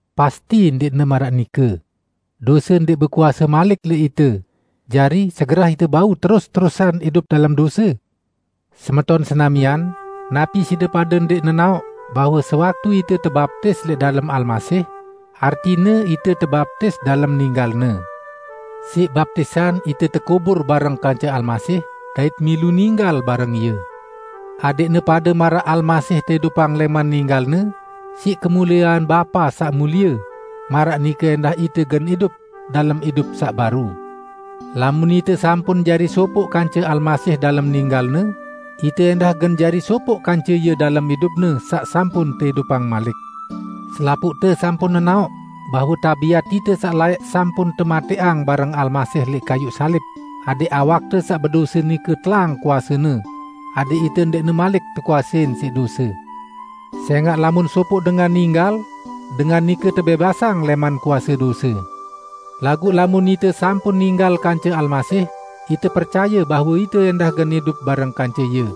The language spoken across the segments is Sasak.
Pasti ndẽqne maraq nike; dose ndẽq bekuase malik lẽq ite, jari segerah ite bau terus-terusan idup dalem dose? Semeton senamian, napi side pade ndẽq nenaoq bahwe sewaktu ite tebaptis lẽq dalem Almasih, artine ite tebaptis dalem ninggal-Ne. Siq baptisan ite tekubur bareng kance Almasih dait milu ninggal bareng Ie, adẽqne pade maraq Almasih teidupang lẽman ninggal-Ne siq kemuliean Bapa saq mulie, maraq nike ẽndah ite gen idup dalem idup saq baru. Lamun ite sampun jari sopoq kance Almasih dalem ninggal-Ne, ite ẽndah gen jari sopoq kance Ie dalem idup-Ne saq sampun teidupang malik. Selapuqte sampun nenaoq, bahwe tabiat ite saq laẽq sampun tematẽqang bareng Almasih lẽq kayuq salib adẽq awakte saq bedose nike telang kuasene, adẽq ite ndẽqne malik tekuasein siq dose. Sẽngaq lamun sopoq dengan ninggal, dengan nike tebẽbasang lẽman kuase dose. Laguq lamun ite sampun ninggal kance Almasih, ite percaye bahwe ite ẽndah gen idup bareng kance Ie.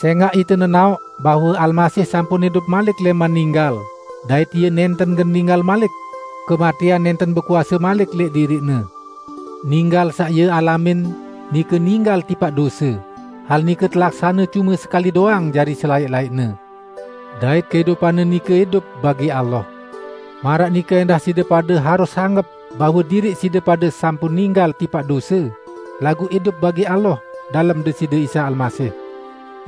Sẽngaq ite nenaoq bahwe Almasih sampun idup malik lẽman ninggal, dait Ie nẽnten gen ninggal malik; kematẽan nẽnten bekuase malik lẽq diriq-Ne. Ninggal saq Ie alamin, nike ninggal tipaq dose, hal nike telaksane cume sekali doang jari selaẽq-laẽqne. Dait kehidupan-Ne nike idup bagi Allah. Maraq nike ẽndah side pade harus anggep bahwe diriq side pade sampun ninggal tipaq dose, laguq idup bagi Allah dalem Deside Isa Almasih.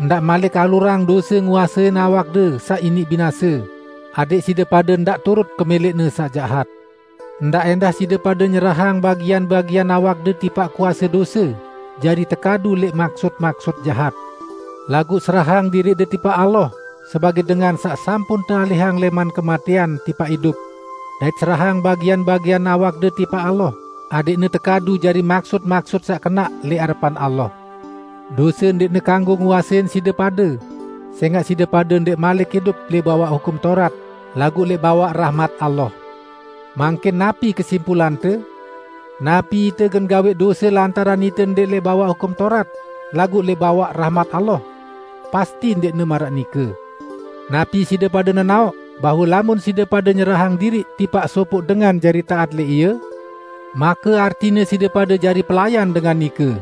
Ndaq malik alurang dose nguasein awakde saq iniq binase, adẽq side pade ndaq turut kemẽlẽqne saq jahat. Ndaq ẽndah side pade nyerahang bagian-bagian awakde tipaq kuase dose jari tekadu lẽq maksut-maksut jahat. Laguq serahang diriqde tipaq Allah sebagẽ dengan saq sampun tealihang lẽman kematẽan tipaq idup. Dait serahang bagian-bagian awakde tipaq Allah adẽqne tekadu jari maksut-maksut saq kenaq lẽq arepan Allah. Dose ndẽqne kanggo nguasein side pade, sẽngaq side pade ndẽq malik idup lẽq bawaq Hukum Taurat, laguq lẽq bawaq rahmat Allah. Mangkin napi kesimpulante? Napi ite gen gawẽq dose lantaran ite ndẽq lẽq bawaq Hukum Taurat, laguq lẽq bawaq rahmat Allah? Pasti ndẽqne maraq nike! Napi side pade nenaoq bahwe lamun side pade nyerahang diriq tipaq sopoq dengan jari taat lẽq ie, make artine side pade jari pelayan dengan nike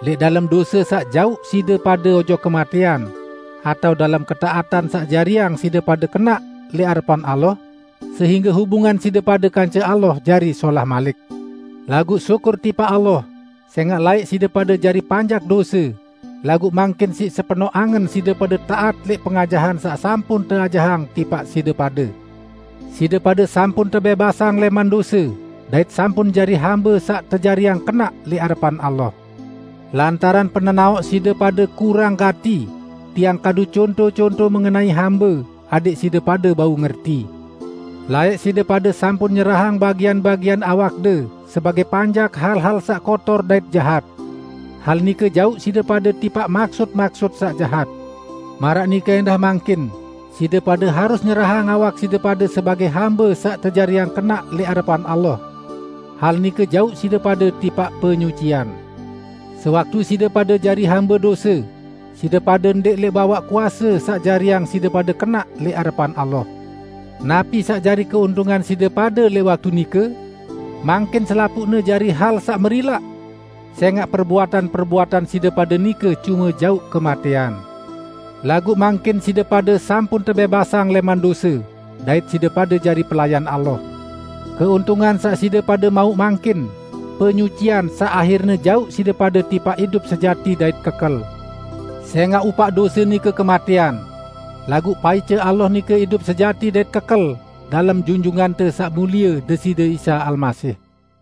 --lẽq dalem dose saq jauq side pade ojok kematẽan, atao dalem ketaatan saq jariang side pade kenaq lẽq arepan Allah sehingge hubungan side pade kance Allah jari solah malik. Laguq syukur tipaq Allah, sẽngaq laẽq side pade jari panjak dose, laguq mangkin siq sepenoq angen side pade taat lẽq pengajahan saq sampun teajahang tipaq side pade. Side pade sampun tebẽbasang lẽman dose, dait sampun jari hambe saq tejariang kenaq lẽq arepan Allah. Lantaran penenaoq side pade kurang gati, tiang kadu conto-conto mengenai hambe, adẽq side pade bau ngerti. Laẽq side pade sampun nyerahang bagian-bagian awakde sebagẽ panjak hal-hal saq kotor dait jahat. Hal nike jauq side pade tipaq maksut-maksut saq jahat. Maraq nike ẽndah mangkin side pade harus nyerahang awak side pade sebagẽ hambe saq tejariang kenaq lẽq arepan Allah. Hal nike jauq side pade tipaq penyucian. Sewaktu side pade jari hambe dose, side pade ndẽq lẽq bawaq kuase saq jariang side pade kenaq lẽq arepan Allah. Napi saq jari keuntungan side pade lẽq waktu nike? Mangkin selapuqne jari hal saq merilaq, sẽngaq perbuatan-perbuatan side pade nike cume jauq kematẽan. Laguq mangkin side pade sampun tebẽbasang lẽman dose, dait side pade jari pelayan Allah, keuntungan saq side pade mauq mangkin, penyucian saq ahirne jauq side pade tipaq idup sejati dait kekel. Sẽngaq upaq dose nike kematẽan; laguq paice Allah nike idup sejati dait kekel dalem Junjungante Saq Mulie Deside Isa Almasih.